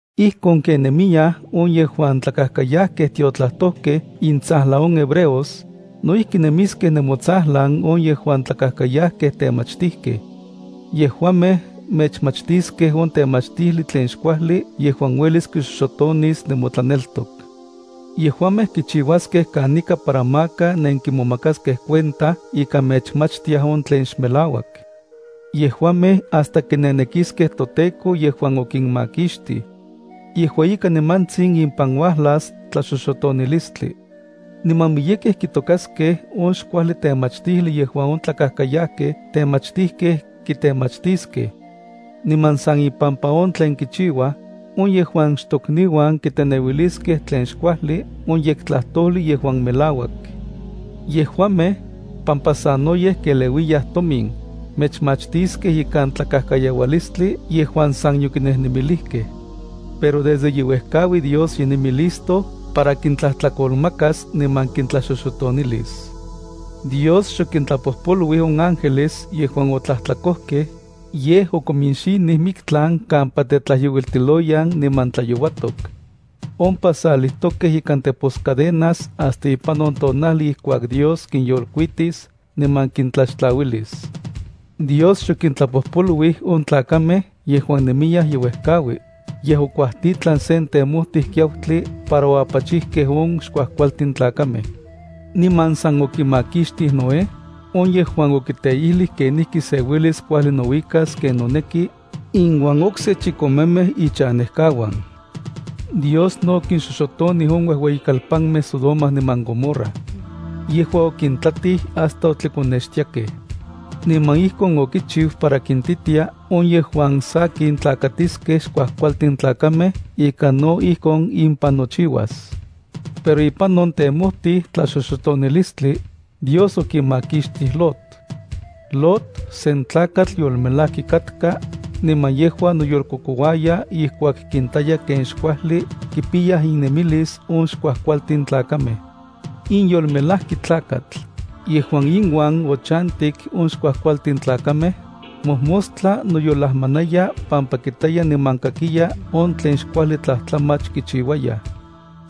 Ijkon ken nemiyaj on yejuan tlakajkayajkej tiotlajtojkej intsajlan on hebreos, no ijki nemiskej nemotsajlan on yejuan tlakajkayajkej temachtijkej. Yejuamej mechmachtiskej on temachtijli tlen xkuajli yejuan uelis kixoxotonis nemotlaneltok. Yejuamej kichiuaskej kanika para maka nenkimomakaskej cuenta ika mechmachtiaj on tlen xmelauak. Yejuamej hasta kinenekiskej toTEKO yejuan okinmakixtij. Yejua ika nimantsin impan uajlas tlaxoxotonilistli. Niman miyekej kitokaskej on xkuajli temachtijli yejuan on tlakajkayajkej temachtijkej kitemachtiskej. Niman san ipampa on tlen kichiuaj, on yejuan xtokniuan kiteneuiliskej tlen xkuajli on yektlajtojli yejuan melauak. Yejuamej, pampa sanoyej keleuiyaj tomin, mechmachtiskej ikan tlakajkayaualistli yejuan san yokinejnemilijkej. Pero desde ye uejkaui Dios ye nemi listo para kintlajtlakolmakas niman kintlaxoxotonilis. Dios xokintlapojpoluij on ángeles yejuan otlajtlakojkej, yej okominxinij miktlan kampa tetlajyouiltiloyan niman tlayouatok. Ompa salijtokej ikan teposcadenas hasta ipan on tonajli ijkuak Dios kinyolkuitis niman kintlaxtlauilis. Dios xokintlapojpoluij on tlakamej yejuan nemiyaj ye uejkaui, yej okuajtitlan sen temojtij kiautli para oapachijkej on xkuajkualtin tlakamej. Niman san okimakixtij Noé, on yejuan okiteijlij kenijki se uelis kuajli nouikas ken noneki, iuan chikome ifamilia. Dios no okinxoxotonij on uejueyikalpamej Sodoma niman Gomorra. Yejua okintlatij hasta otlikonextiakej. Niman ijkon okichiu para kintitia on yejuan sakin tlakatiskej xkuajkualtin tlakamej ika no ijkon impan nochiuas. Pero ipan on temojtij tlaxoxotonilistli, Dios okimakixtij Lot. Lot sen tlakatl yolmelaki katka, niman yejua noyolkokouaya ijkuak kintaya ken xkuajli kipiyaj innemilis on xkuajkualtin tlakamej. In yolmelajki tlakatl, yejuan inuan ochantik on xkuajkualtin tlakamej, mojmostla noyolajmanaya pampa kitaya niman kakiya on tlen xkuajli tlajtlamach kichiuayaj.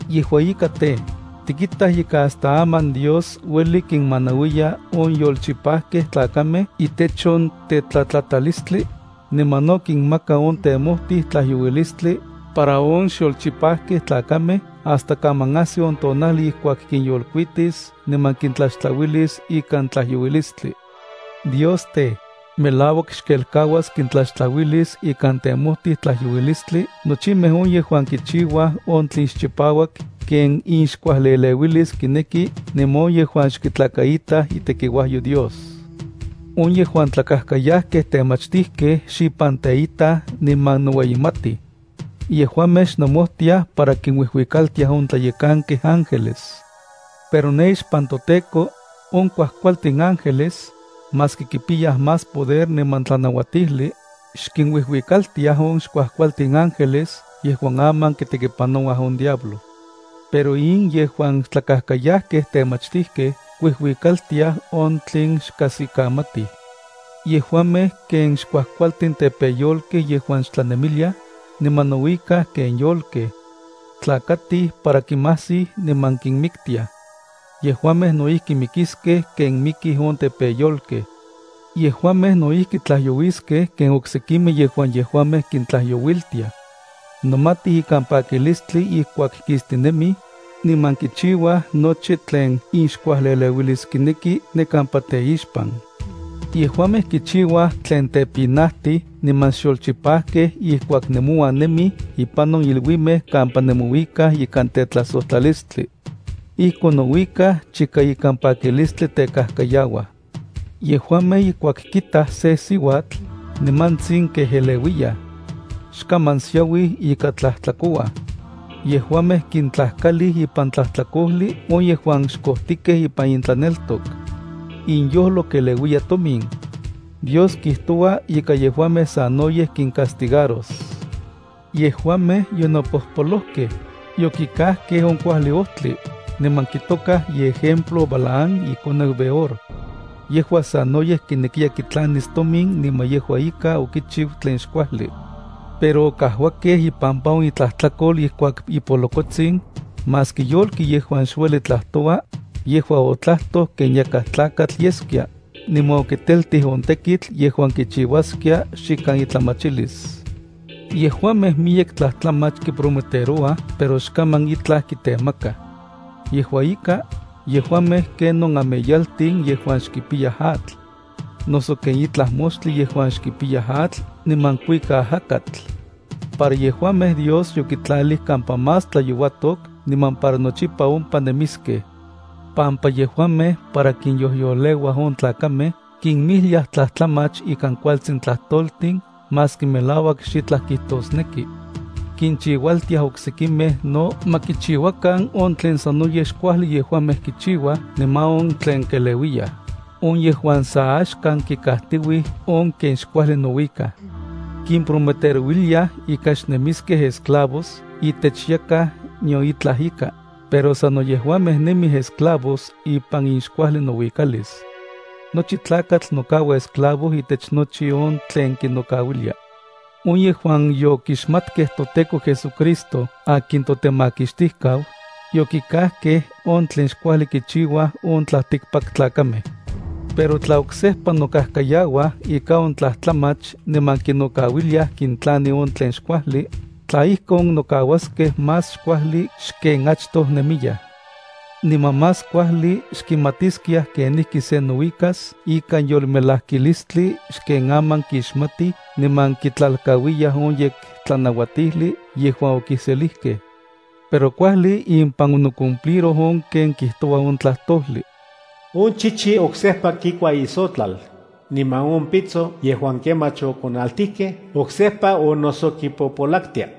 Yejua ika tej, tikitaj ika hasta aman Dios ueli kinmanauiya on yolchipakej tlakamej itech on tetlatlatalistli, niman no kinmaka on temojtij tlajyouilistli para on xyolchipajkej tlakamej hasta kaman ajsi on tonajli ijkuak kinyolkuitis niman kintlaxtlauilis ikan tlajyouilistli. Dios tej, melauak xkelkauas kintlaxtlauilis ikan temojtij tlajyouilistli nochimej on yejuan kichiuaj on tlen xchipauak ken inxkuajli eleuilis kineki niman on yejuan xkitlakaitaj itekiuajyo Dios. On yejuan tlakajkayajkej temachtijkej xipan teitaj niman noueyimatij. Yejuamej xnomojtiaj para kinuijuikaltiaj on tlayekankej ángeles. Pero ne ixpan toTEKO, on kuajkualtin ángeles, maski kipiyaj más poder niman tlanauatijli, xkinuijuikaltiaj on xkuajkualtin ángeles yejuan aman kitekipanouaj on diablo. Pero in yejuan tlakajkayajkej temachtijkej kiuijuikaltiaj on tlen xkajsikamatij. Yejuamej ken xkuajkualtin tepeyolkej yejuan xtlanemiliaj, niman nouikaj ken yolkej. Tlakatij para kimajsij niman kinmiktiaj. Yejuamej no ijki mikiskej ken mikij on tepeyolkej. Yejuamej no ijki tlajyouiskej ken oksekimej yejuan yejuamej kintlajyouiltiaj. Nomatij ikan pakilistli ijkuak kistinemij, niman kichiuaj nochi tlen inxkuajli eleuilis kineki ne kampa teixpan. Yejuamej kichiuaj tlen tepinajtij niman xyolchipajkej ijkuak nemouan nemij ipan on iluimej kampa nemouikaj ikan tetlajsojtlalistli. Ijkon nouikaj chika ikan pakilistli tekajkayauaj. Yejuamej ijkuak kitaj sen siuatl, nimantsin kejeleuiyaj. Xkaman siauij ika tlajtlakouaj. Yejuamej kintlajkalij ipan tlajtlakojli on yejuan xkojtikej ipan intlaneltok. Inyojlo keleuiya tomin. Dios kijtoua ika yejuamej sanoyej kincastigaros. Yejuamej yonopojpolojkej, yokikajkej on kuajli ojtli, niman kitokaj iejemplo Balaam ikoneu Beor. Yejua sanoyej kinekiya kitlanis tomin niman yejua ika okichiu tlen xkuajli. Pero okajuakej ipampa on itlajtlakol ijkuak ipolokotsin, maski yolki yejuan xueli tlajtoua, yejua otlajtoj ken yakaj tlakatl yeskia, niman okiteltij on tekitl yejuan kichiuaskia xikan itlamachilis. Yejuamej miyek tlajtlamach kiprometerouaj pero xkaman itlaj kitemakaj. Yejua ika, yejuamej ken on ameyaltin yejuan xkipiyaj atl, noso ken itlaj moxtli yejuan xkipiya atl niman kuika ajakatl. Para yejuamej Dios yokitlalij kampa más tlayouatok niman para nochipa ompa nemiskej, pampa yejuamej para kinyojyoleuaj on tlakamej kinmijliaj tlajtlamach ikan kualtsin tlajtoltin maski melauak xitlaj kijtosneki. Kinchiualtiaj oksekimej no ma kichiuakan on tlen sanoyej xkuajli yejuamej kichiuaj niman on tlen keleuiyaj, on yejuan sa axkan kikajtiuij on ken xkuajli nouikaj. Kimprometerouiliaj ika xnemiskej esclavos itech yakaj nion itlaj ika, pero sano yejuamej nemij esclavos ipan inxkuajli nouikalis. Nochi tlakatl nokaua esclavo itech nochi on tlen kinokauilia. On yejuan yokixmatkej toTEKO JesuCristo akin toTemakixtijkau, yokikajkej on tlen xkuajli kichiuaj on tlaltikpaktlakamej. Pero tla oksejpa nokajkayauaj ika on tlajtlamach niman kinokauiliaj kintlani on tlen xkuajli, tla ijkon, nokauaskej más xkuajli xken achtoj nemiyaj. Niman más kuajli xkixmatiskiaj kenijki se nouikas ikan yolmelajkilistli xken aman kixmatij niman kitlalkauiyaj on yektlanauatijli yejuan okiselijkej. Pero kuajli impan onocumpliroj on ken kijtoua on tlajtojli: “On chichi oksejpa kikua isotlal, niman on pitso yejuan kemach okonaltijkej oksejpa onnosokipopolaktia.”